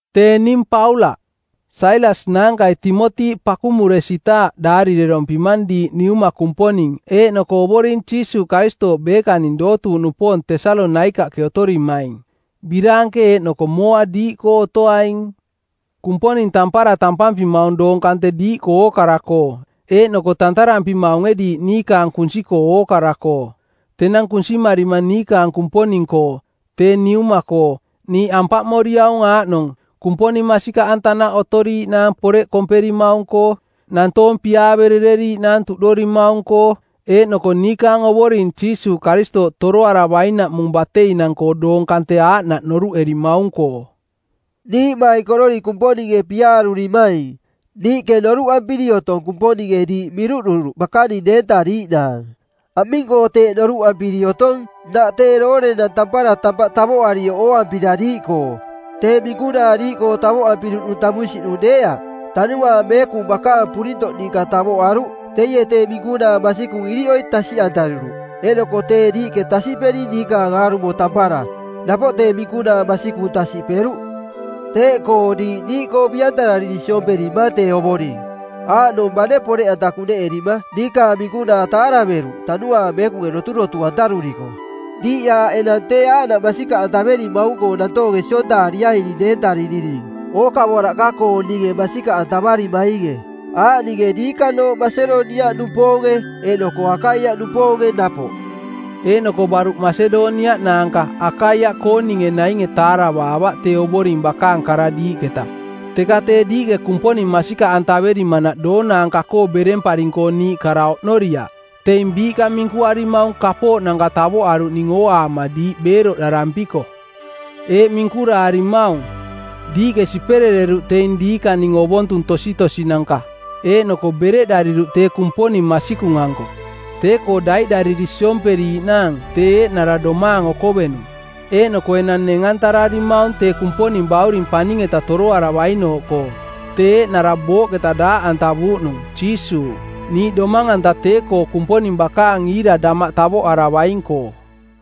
Tee ning Paulaꞌ. Sailas naankai Timoti pakumuresitaaꞌ daarirerompimang diiꞌ Niuma Kumponing eeꞌnoko Ovoring Jiisuuꞌ Karistooꞌ beekaning dootuuꞌnupoong Tesalonaikaꞌke otorimaing. Biraanke eeꞌnoko mooa diiꞌkoo otoaing. Kumponing tampara tampampimaung doong kante diiꞌkoo ookara-koo eeꞌnoko tantarampimaunge diiꞌ niikaang kunsi-koo ookara-koo. Tenang kunsimarima niikaang Kumponing-koo, tee Niuma-koo, niiꞌ ampaꞌmoriaung aaꞌnong: Kumponing masikaꞌantanaꞌ otoriiꞌnaang poreꞌ komperimaung-koo, nantoong piaaverereriiꞌnaang tuꞌdorimaung-koo, eeꞌnoko niikaang Ovoring Jiisuuꞌ Karistooꞌ toroaravainaꞌmung bateinang-koo doong kante aaꞌnaꞌ noruꞌerimaung-koo. Niiꞌmaikororiꞌ Kumponinge piaarurimaing, niiꞌke noruꞌampiri otong Kumponinge diiꞌ miruꞌduruꞌ bakaning deentariiꞌnaang. Aming-koo teeꞌ noruꞌampiri otong? Nnaꞌ tee doorenang tampara tampaꞌ tavoꞌarioꞌ ooampira diiꞌkoo. Tee minkunaa diiꞌkoo tavoꞌampiruꞌnung tamunsiꞌnung deeaꞌ, Tanuaang Meekung bakaang purintoꞌ ninka tavoꞌaruꞌ. Teie tee minkunaa masikung iriꞌoi tasiꞌantaruruꞌ. Eeꞌnoko tee diiꞌke tasiꞌperi niikaang aarumo tampara, napoꞌ tee minkunaa masikung tasiꞌperuꞌ. Teeꞌkoo diiꞌ niiꞌkoo biꞌantarariri siomperimang tee Ovoring, aaꞌnong bane poreꞌanta kuneꞌerima niikaang minkunaa taaraveruꞌ Tanuaang Meekunge doturotu-antaruriko. Diiꞌ aaꞌ enang tee aaꞌnaꞌ masikaꞌantaverimaung-koo nantoonge siontaariaining deentaririning ookavoraꞌka-kooninge masikaꞌantavarimainge, aaꞌninge diikanooꞌ Masedoniaꞌnupoonge eeꞌnoko Akaiaꞌnupoonge napoꞌ. Eeꞌnoko baruꞌ Masedoniaꞌ naanka Akaiaꞌkooning nainge taaravaavaꞌ tee Ovoring bakaang kara diiꞌketa, teka tee diiꞌke Kumponing masikaꞌantaverimanaꞌ doonaanka-koo beremparing-koo niiꞌ kara oꞌnoriaꞌ. Teing biiꞌka minkuarimaung kapooꞌnanka tavoꞌaruꞌning ooaama diiꞌ beeroꞌdarampiko. Eeꞌ minkuraarimaung: Diiꞌke siperereruꞌ teing diikaning ovontung tositosinanka; eeꞌnoko bereꞌdariruꞌ tee Kumponing masikung-anko, tee-koo daiꞌdariri siomperiiꞌnaang, tee eeꞌnara domaang okovenung; eeꞌnoko enang neng-antararimaung tee Kumponing Bauring paning-eta toroaravainooꞌkoo. Tee eeꞌnara booꞌketa daaꞌantavuuꞌnung, Jiisuuꞌ, niiꞌ domang-anta tee-koo Kumponing bakaang iira damaꞌ tavoꞌaravaing-koo.